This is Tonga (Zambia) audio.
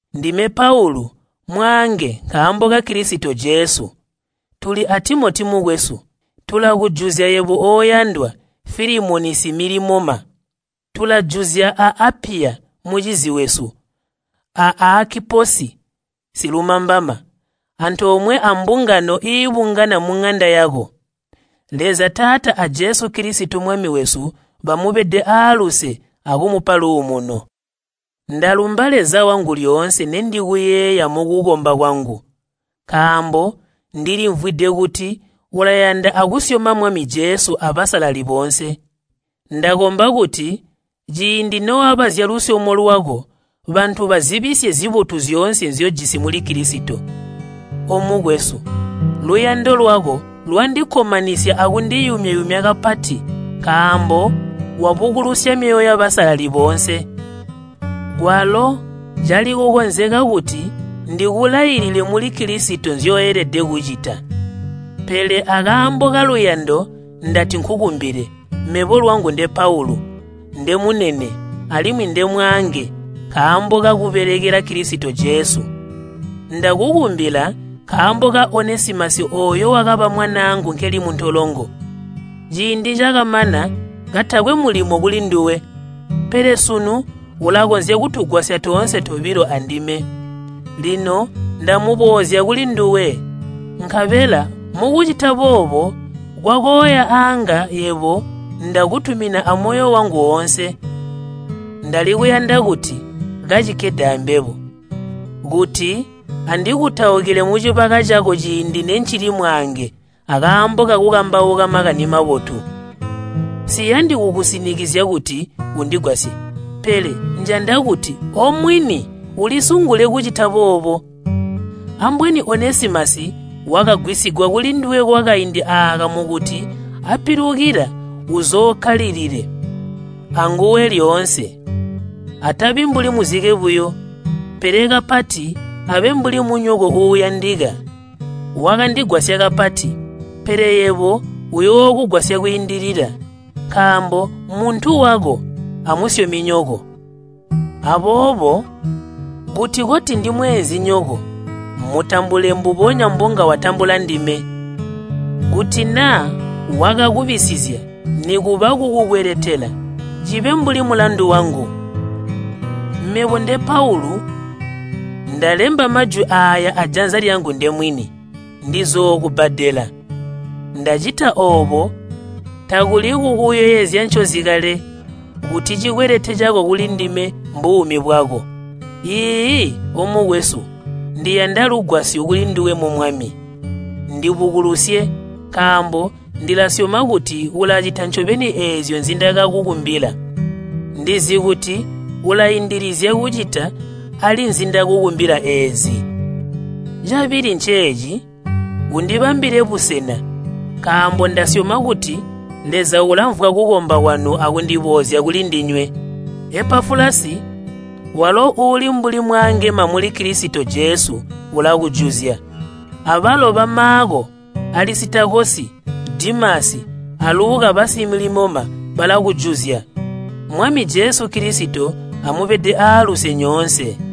Ndime Paulu, mwaange nkaambo ka Kilisito Jesu, tuli a Timoti mukwesu. Tulakujuzya yebo oyandwa Filimoni similimoma. Tulajuzya a Apiya mucizi wesu, a Aakiposi silumambama, antoomwe ambungano iibungana muŋanda yako. Leza Taata a Jesu Kilisito Mwami wesu bamubede aaluse akumupa luumuno. Ndalumba Leza wangu lyoonse nendikuyeeya mukukomba kwangu, nkaambo ndilimvwide kuti ulayanda akusyoma Mwami Jesu abasalali boonse. Ndakomba kuti ciindi noaba zyalusyomo lwako bantu bazibisye zibotu zyoonse nzyojisi muli Kilisito. Omukwesu, luyando lwako lwandikkomanisya akundiyumya-yumya kapati nkaambo wabukulusya myoyo yabasalali boonse. Kwalo cali kukonzeka kuti ndikulailile muli Kilisito nzyoelede kucita. Pele akaambo kaluyando ndati nkukumbile, mebo lwangu nde Paulu, ndemunene alimwi ndemwaange nkaambo kakubelekela Kilisito Jesu. Ndakukumbila nkaambo ka Onesimasi ooyo wakaba mwanaangu nkeli muntolongo. Ciindi cakamana katakwe mulimo kulinduwe, pele sunu ulakonzya kutugwasya toonse tobilo andime. Lino ndamuboozya kulinduwe, nkabela mukucita boobo kwakoya aanga yebo ndakutumina amoyo wangu woonse. Ndali kuyanda kuti kacikkede ambebo, kuti andikutaukile mucibaka cako ciindi nencili mwaange akaambo kakukambauka Makani Mabotu. Nsiyandi kukusinikizya kuti undigwasye pele njanda kuti omwini ulisungule kucita boobo. Ambweni Onesimasi wakagwisigwa kulinduwe kwakaindi aaka mukuti ampilukila uzookkalilile anguwe lyoonse. Atabi mbuli muzike buyo, pele kapati abe mbuli munyoko uuyandika. Wakandigwasya kapati, pele yebo uyookugwasya kwiindilila, nkaambo mmuntu wako amusyominyoko. Aboobo kuti koti ndimweenzinyoko mutambule mbubonya mbonga watambula ndime. Kuti naa wakakubisizya nikuba kukukweletela, cibe mbuli mulandu wangu. Mebo nde Paulu, ndalemba majwi aaya ajanza lyangu ndemwini, ndizookubbadela. Ndacita oobo takuli kukuyeezya ncozi kale kuti cikwelete cako kulindime mbuumi bwako. Iiyi, omukwesu, ndiyanda lugwasyo kulinduwe mu Mwami. Ndibukulusye nkaambo ndilasyoma kuti ulacita ncobeni eezyo nzindakukumbila. Ndizi kuti ulaindilizya kucita ali nzindakumbila eezi. Cabili nceeci, undibambile busena nkaambo ndasyoma kuti Leza ulamvwa kukomba kwanu akundiboozya kulindinywe. Epafulasi walo uuli mbuli mwaangema muli Kilisito Jesu ulakujuzya, abalo ba, Maako, Alisitakosi, Dimasi, a Luka basimilimoma balakujuzya. Mwami Jesu Kilisito amubede aaluse nyoonse.